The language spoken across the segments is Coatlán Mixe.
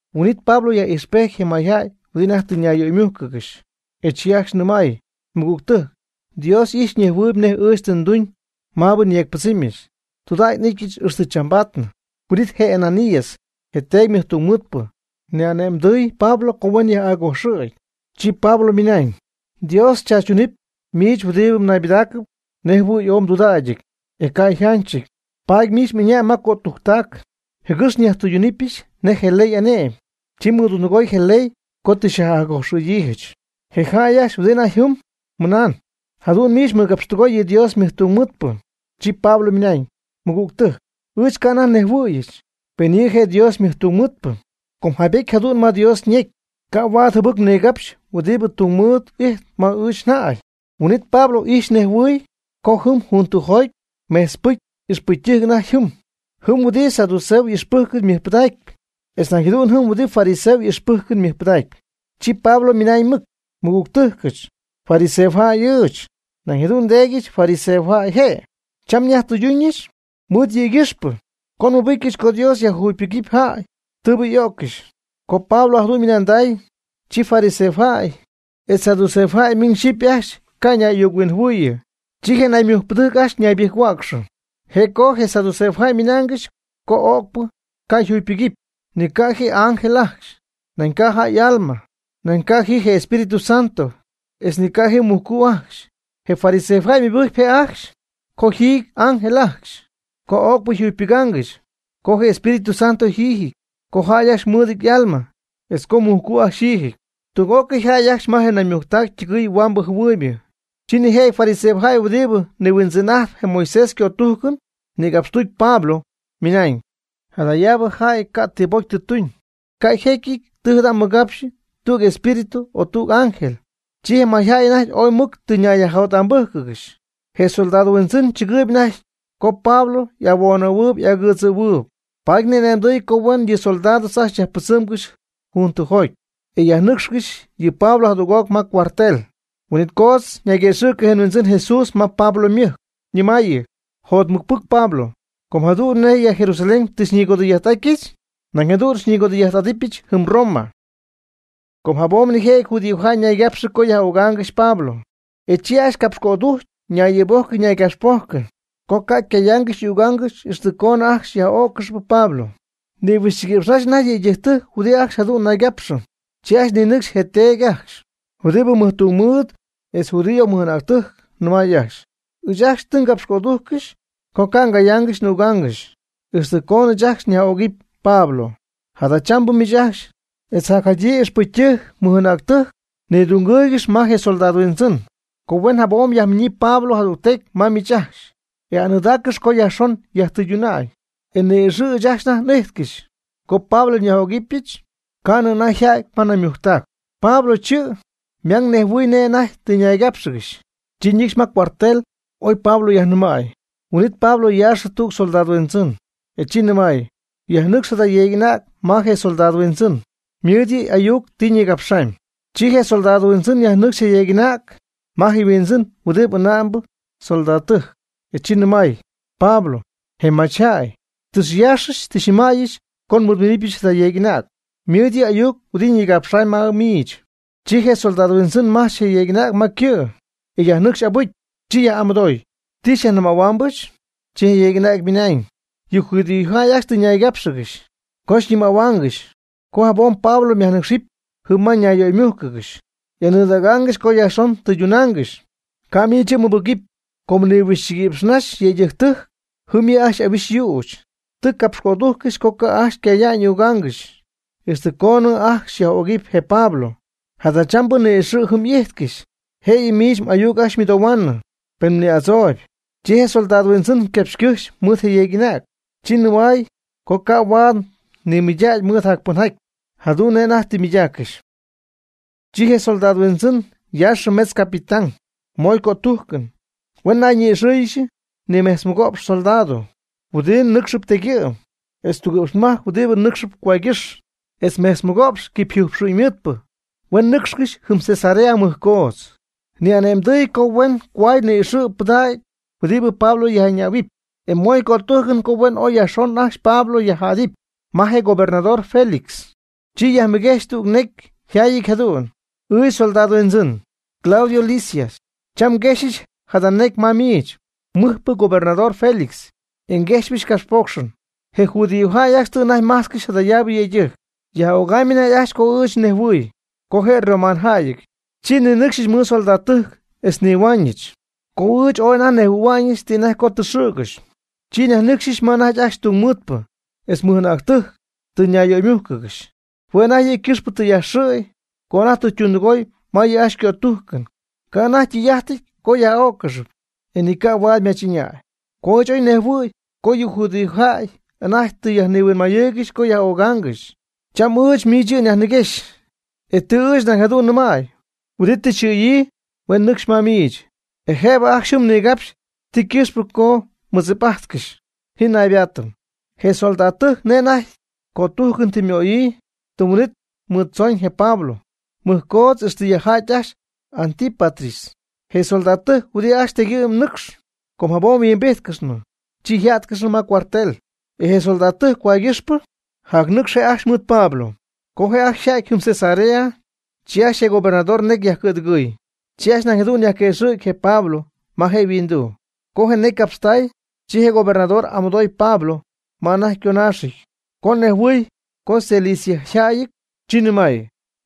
Huin'it Pablo yaj'ijxpejty je mayjäy huɨdi anajty tɨ nayyöymújcɨgɨxy, e chi ajcxy nɨmay: ―Mɨgügtɨjc, Dios y'ijxpy ñejhuɨɨyb nej ɨɨch tɨ nduñ maabɨ nyeecpɨdzɨmyɨch, tudägy n'ityɨch ixtɨ chambaadnɨ. Huin'it je Ananías, je teedy mɨjtungmɨɨdpɨ, ni'ane'mdɨɨy Pablo co huen yaj'accojxɨ̈gy. Chi Pablo ymɨnañ: ―¡Dios xychaachytunɨpy miich huɨdibɨ mnaybɨdaacɨp nej jɨhuɨy ooy mdudägyjäyɨty, e ca' yjanchɨty! Paady miich m'ɨñäy ma cötujctac jɨgɨx nyajtɨydunɨpyɨch nej je ley y'ane'my. Chi mmɨdundɨgooy je ley co tɨ xyajcojxyiijɨch. Je jäy ajcxy huɨdi anajty jɨm mɨnañ: ―¿Jadu'n miich mmɨgapxtɨgoy yɨ Dios ymɨjtungmɨɨdpɨ? Chi Pablo ymɨnañ: ―Mɨgügtɨjc, ɨɨch ca' anajty nejhuɨ̈yɨch, pen yɨ' je' Dios ymɨjtungmɨɨdpɨ. Com jaybety jadu'n ma Dios ñecy: “Ca' huaad jɨbɨc mnigapxɨpy huɨdi tungmɨɨd ijtp ma miich mjäy.” Huin'it Pablo ijxy nejhuɨɨy co jɨm juntɨ'joty mejtzpɨcy ixpɨcytɨjc anajty jɨm, jɨm huɨdi saduceo y'ixpɨjcɨn ymɨjpɨdacp etz nañ jadu'n jɨm huɨdi fariseo y'ixpɨjcɨn ymɨjpɨdacp, chi Pablo ymɨnañ mɨc: ―Mɨgügtɨjcɨch, fariseojäy ɨɨch, nañ jadu'n ndeedyɨch fariseojäy je'. Cham nyajtɨyduñɨch mɨɨd jëgɨxpɨ co nmɨbɨcyɨch co Dios yajjugypɨgɨpy jäy tɨɨbɨ y'öccɨxy. Co Pablo jadu'n ymɨnanday, chi fariseojäy etz saduceojäy miñ xyɨpy ajcxy ca' ñay'ayuc-huinjɨhuɨɨyɨ. Chi je naymujcpɨdɨjc ajcxy ñaybɨjc-huäcxɨ. Je' co je saduceojäy ymɨnaangɨxy co o'cpɨ ca' yjugypɨgɨpy, ni ca' ji ángel ajcxy, nañ ca' jäy y'alma, nañ ca' ji je Espíritu Santo, etz ni ca' ji mujcu' ajcxy. Je fariseojäy ymɨbɨjcpy je' ajcxy co yjiijɨty ángel ajcxy, co öcpɨ jugypɨgaangɨxy, co je Espíritu Santo yjiijɨty, co jäy ajcxy mɨɨdɨty y'alma, etz co mujcu' ajcxy yjiijɨty. Tüg'ócɨy jäy ajcxy ma je naymujctac ytɨgɨɨy huambɨ jɨhuɨɨybɨ. Chi nijëjɨty fariseojäy huɨdi nihuindzɨn'ajtpy je Moisés ycötújcɨn nïgapxtuty Pablo ymɨnañ: ―Jadayaabɨ jäy ca' ti pocy tɨ tuñ. Ca' yjecyɨty tɨ jada' ymɨgapxyii tüg espíritu o tüg ángel. Chi je mayjäy anajty ooy mɨc tɨ ñayyajjot'ambɨ́jcɨgɨxy. Je soldado huindzɨn tzɨgɨɨyb anajty co Pablo y'ahuoonnɨ̈huɨɨyb y'agɨdzɨ̈huɨɨyb, paady ni'ane'mdɨy huen yɨ soldado ajcxy yajpɨdzɨmgɨxy juntɨjoty e yajnɨ́cxcɨxɨpy yɨ Pablo jadüg'oc ma cuartel. Huin'it coodz ñayguëxɨ̈cɨ je Huindzɨn Jesús ma Pablo ymɨjc, nɨmaayɨ: ―Jotmɨcpɨc Pablo, com jadu'n nej ya Jerusalén tɨ xyñigodɨy'ajt'átyɨch, nañ jadu'n xyñigodɨy'ajt'adɨpyɨch jɨm Roma. Com jabom nijëjɨty judíojäy ñaygapxɨ co yaj'ögaangɨxy Pablo. E chi ajcxy capxycödujcy ñay'ɨɨbojcɨ ñaygapxpojcɨ co ca' ycayaangɨxy y'ügaangɨxy ixtɨ coonɨ ajcxy yaj'öccɨxɨpy Pablo. Nihuixchiguïpx naxy anajty yëydɨjctɨjc huɨdi ajcxy jadu'n naygapxɨ. Chi ajcxy ninɨcxy je teedy ajcxy huɨdibɨ mɨjtungmɨɨd etz judío mɨj'anäctɨjc, nɨmay ajcxy: ―Ɨɨch ajcxy tɨ ngapxycödujccɨxy co ca' ngayáangɨxyɨch n'ügáangɨxyɨch ixtɨ coonɨ ɨɨch ajcxy nyaj'öcɨp Pablo. Jadachambɨ miich ajcxy, etz jacjadyii ixpɨcytɨjc mɨj'anäctɨjc nidungɨɨygɨxy ma je soldado huindzɨn, co huen jabom yajminyii Pablo jadügtecy ma miich ajcxy. E aanɨɨdaaccɨxy co jacyajxon yajtɨyduna'ñ, e ni'ixɨ̈ ɨɨch ajcxy anajty n'ijtcɨxy co Pablo nyaj'ögɨbɨch ca'nɨ anajty yjäty ma naymujctac. Pablo chɨ' ymang nejhuɨɨy nej je' anajty tɨ ñaygápxɨgɨxy, chi ñɨcxy ma cuartel oy Pablo yajnɨmäy. Huin'it Pablo yaaxɨ tüg soldado huindzɨn, e chi nɨmay: ―Yajnɨcx jada yeeg'anäg ma je comandante, ymɨɨd yɨ' ayuc ti nigapxaamy. Chi je soldado huindzɨn yajnɨcxy je yeeg'anäg ma je comandante, e chi nɨmay: ―Pablo, je machyjäy, tɨ xyaaxyɨch, tɨ xyñɨmäyɨch co nmɨɨdminɨpyɨch jada yeeg'anäg, ymɨɨd yɨ' ayuc huɨdi ñigapxaamy ma miich. Chi je comandante majch je yeeg'anäg ma ycɨ', e yajnɨcxy abɨcy, chi yaj'amɨdooy: ―¿Ti xyajnɨmähuaamyɨch? Chi je yeeg'anäg ymɨnañ: ―Yɨ judíojäy ajcxy tɨ ñaygápxɨgɨxy co xyñɨmähuaangɨxy co jabom Pablo myajnɨcxɨpy jɨm ma ñayyöymugáanɨgɨxy, y'aanɨɨdägaangɨxy co jacyajxon tɨydunaangɨxy. Ca' miich yɨ' mmɨbɨgɨpy; com nihuixchiguïpx naxy yëydɨjctɨjc jɨm yɨ' ajcxy ahuixy yüch. Tɨ capxycödujccɨxy co ca' ajcxy ycaya'ñ y'üga'ñ ixtɨ coonɨ ajcxy yaj'ögɨpy je Pablo. Jadachambɨ ni'ixɨ̈ jɨm y'ijtcɨxy, jëyɨ miich m'ayuc ajcxy xyjamɨdohuaanɨ, pen mni'adzooyb. Chi je comandante ycapxycɨjxy mɨɨd je yeeg'anäg. Chi nɨmay co ca' huaad ymɨydägy mɨɨd jacpɨnjaty jadu'n nej anajty tɨ ymɨydaaccɨxy. Chi je comandante yaaxɨ metz capitán moy cötújcɨn huen nayñi'ixɨ́ɨyɨgɨxy nimejtzmɨgo'px soldado huɨdi nɨcxɨp tegyɨ'm, etz tugɨ'pxmajc huɨdi nɨ́cxɨp cohuaaygɨ́xy, etz mejtz mɨgo'px quipyjɨjpxu'ñmɨɨdpɨ, huen nɨcxcɨxy jɨm Cesarea mɨjcoodz. Nañ ni'ane'mdɨɨy co huen cohuay ni'ixɨ̈ pɨdägyii huɨdi Pablo yaj'ɨñähuɨpy, e moy cötújcɨn co huen oy yajxon ajcxy Pablo yajjädɨpy ma je gobernador Félix. Chi yajmɨguejxy tüg necy yjaayɨty jadu'n: “Ɨɨch comandante, Claudio Lisias, cham nguejxyɨch jada necy ma miich, mɨjpɨ gobernador Félix, e nguejxpyɨch capxpoocxɨn. Je judíojäy ajcxy tɨ anajty majtzcɨxy jadayaabɨ yëydɨjc, yaj'ögamy anajty ajcxy co ɨɨch oy nejhuɨ̈y co je' yromanojäyɨty, chi nninɨcxɨch mɨɨd soldadtɨjc etz nnihuaañɨch. Co ɨɨch ooy anajty nejhuɨ̈hua'ñɨch ti anajty co tɨ xɨ̈gɨxy, chi nyajnɨcxɨch ma anajty ajcxy tungmɨɨdpɨ etz mɨj'anäctɨjc tɨ ñayyöymújcɨgɨxy. Hue' anajty yɨ' ycɨxpɨ tɨ yajxɨ̈y co anajty tɨ ytundɨgooy ma yɨ' ajcxy ycötújcɨn. Ca' anajty ytɨy'ájtɨty co yaj'öccɨxɨpy, e ni ca' huaad ymach'ɨñäy. Co ɨɨch oy nejhuɨ̈y co yɨ judíojäy anajty tɨ nihuinmayɨɨygɨxy co yaj'ögaangɨxy, cham ɨɨch miich yɨ' nyajniguexy. E tɨ ɨɨch nañ jadu'n nɨmay huɨdi tɨ yxɨ̈yii huen nɨcxcɨxy ma miich, e jëbɨ ajcxy jɨm nigapxy ti ycɨxpɨ co mɨdzip'ajtcɨxy. Ji naybaatɨm.” Je soldadtɨjc nej anajty tɨ ycötújcɨn möyii tɨm huin'ítɨy mɨɨd tzooñ je Pablo mɨjcoodz ixtɨ yajja'ty ajcxy Antípatris. Je soldadtɨjc huɨdi ajcxy tegyɨ'm nɨcxp, com jabom huimbíjtcɨxnɨ, chi yjá'tcɨxnɨ ma cuartel. E je soldadtɨjc cohuaygɨxpɨ jacnɨcxy je' ajcxy mɨɨd Pablo. Co je' ajcxy yja'ty jɨm Cesarea, chi ajcxy je gobernador necy yajcɨ̈dɨgɨɨy, chi ajcxy nañ jadu'n yajquëxɨ̈gy je Pablo ma je' yhuinduu. Co ñecy capxtay, chi je gobernador y'amɨdooy Pablo ma anajty yconaaxɨty. Co nejhuɨɨy co yCiliciajäyɨty, chi nɨmay: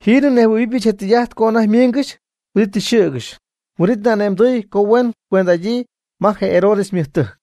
―Jiinɨ nejhuɨ̈huɨbɨch je tɨy'ajt co anajty miingɨxy huɨdi tɨ xyxɨ̈gɨxy. Huin'it ni'ane'mdɨɨy co huen cuend'adyii ma je Herodes ymɨjtɨjc.